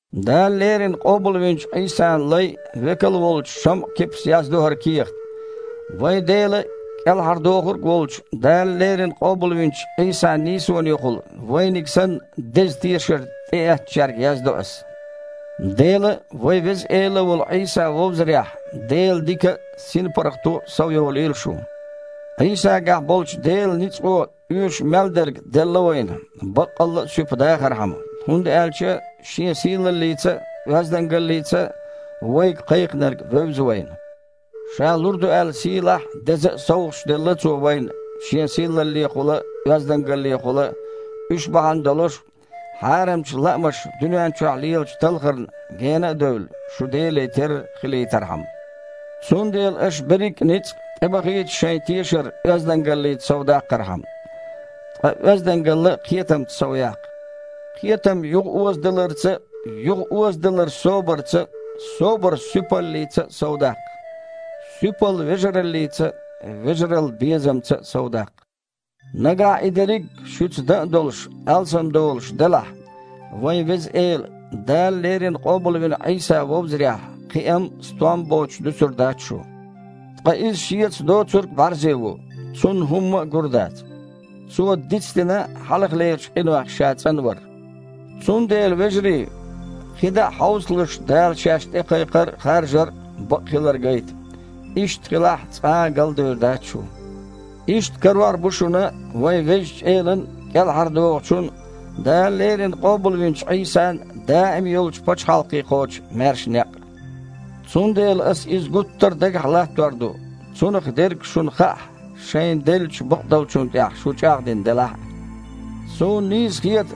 Дала леррина къобалвинчу Іийсан лай а, векал а волчу ШамІа-Кипас яздо хІара кехат. Вайн Дела а, КІелхьардохург а волчу Дала леррина къобалвинчу Іийсан нийсонехула, вайниг санна, деза тешар тІеэцначаьрга яздо ас. Дела а, вайн Веза Эла волу Іийса а вовзарехь Делан дика а, синпаргІато а совйолийла шун. Іийсагахь болчу Делан ницкъо оьшуш мел дерг делла вайна баккъалла а суьпа дахархьама, хІунда аьлча Шен сийлаллица а, оьздангаллица а вайга Кхайкхийнарг вевза вайна. Ша лур ду аьлла сийлахь а, деза а совгІаташ делла Цо вайна Шен сийлаллехула а, оьздангаллехула а, уьш бахьана долуш, хьарамчу лаамаша дуьнен чохь лелачу талхарна гена а девлла, шу Деле терра хилийтархьама. Цундела аша берриг а ницкъ тІебахийта шайн тешар оьздангаллица совдаккхархьама. Ткъа оьздангалла кхетамца совъяккха. Кхетам юхаозадаларца а, юхаозадалар собарца а, собар суьпаллица а совдаккха. Суьпалла вежараллица а, вежаралла безамца а совдаккха. Нагахь и дерриг а, шуьца дан а долуш, алсамдолуш делахь, вайн Веза Эла, Дала леррина къобалвина Іийса вовзарехь кхиам а, стом а боцуш дуьсур дац шу. Ткъа иза шеца доцург бІаьрзе ву. Цунна хІумма а гур дац. Цо дицдина хьалхалерчу къинойх ша цІанвар. Цундела, вежарий, кхидІа а хьовсалаш Дала шаьш тІекхайкхар а, харжар а бакъ хилар гайта. Иштта хилахь, цкъа а галдевр дац шу. Иштта карор бу шуна вайн Везачу Элан, КІелхьардохучун, Дала леррина къобалвинчу Іийсан даим йолчу пачхьалкхе кхочу маьрша некъ. Цундела ас иза гуттар а дагахь латтор ду, цунах дерг шуна хаахь а, шайна деллачу бакъдолчунна тІехь шу чІагІдина делахь а. Суна нийса хета,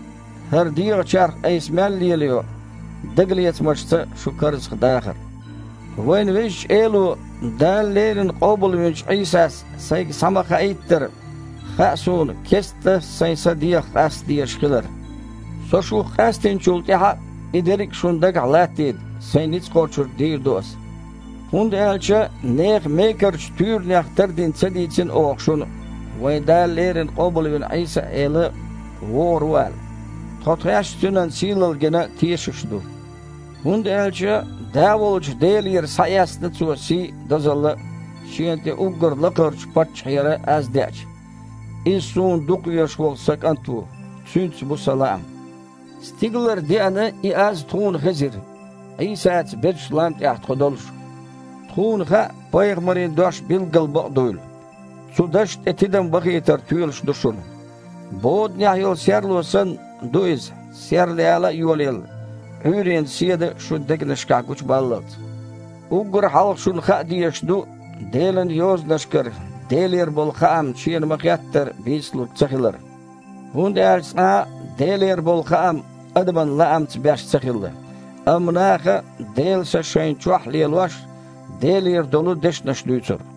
хІара дегІан чарх айса мел лелайо, дагалецамашца шу карзахдахар. Вайн Везачу Эло, Дала леррина къобалвинчу Іийсас сайга схьа-ма-хаийттара, хаьа суна кестта сайн са дегІах къаста дезаш хилар. Со шух къаьстинчул тІаьхьа а, и дерриг а шуна дагахь латтийта, сайн ницкъ кхочург дийр ду ас. ХІунда аьлча нехан мекарчу туьйранех тардина ца дийцина оха шуна, вайн Дала леррина къобалвина Іийса-Эла вогІур ву аьлла. Тхо тхаьш Цуьнан сийлалла гина тешаш ду. ХІунда аьлча Да волчу Делера схьаэцна Цо сий а, дозалла а, Шена тІе уггар лакхарчу Паччахьера аз деача: «Иза Суна дукхавезаш волу Сан кІант ву, Цуьнца бу Сан лаам!» Стигалара деана и аз тхуна хезира, Іийсаца безачу лам тІехь тхо долуш. Тхуна хаьа пайхамарийн дош билггала бакъ дуйла. Цу дашна тІе тидам бахийтар тоьлуш ду шуна. Боданехь йолу серло санна, ду иза, серлаяла а йолаелла, Іуьйренан седа шун дегнашкахь гучубаллалц. Уггар хьалха шуна хаа дезаш ду Делан Йозанашкара Делера болу хаам шена ма-хеттара бийцалург цахилар. ХІунда аьлча цкъа а Делера болу хаам адаман лаамца беш ца хилла, амма наха, Делан Са шайна чохь а лелош, Делера долу дешнаш дуьйцура.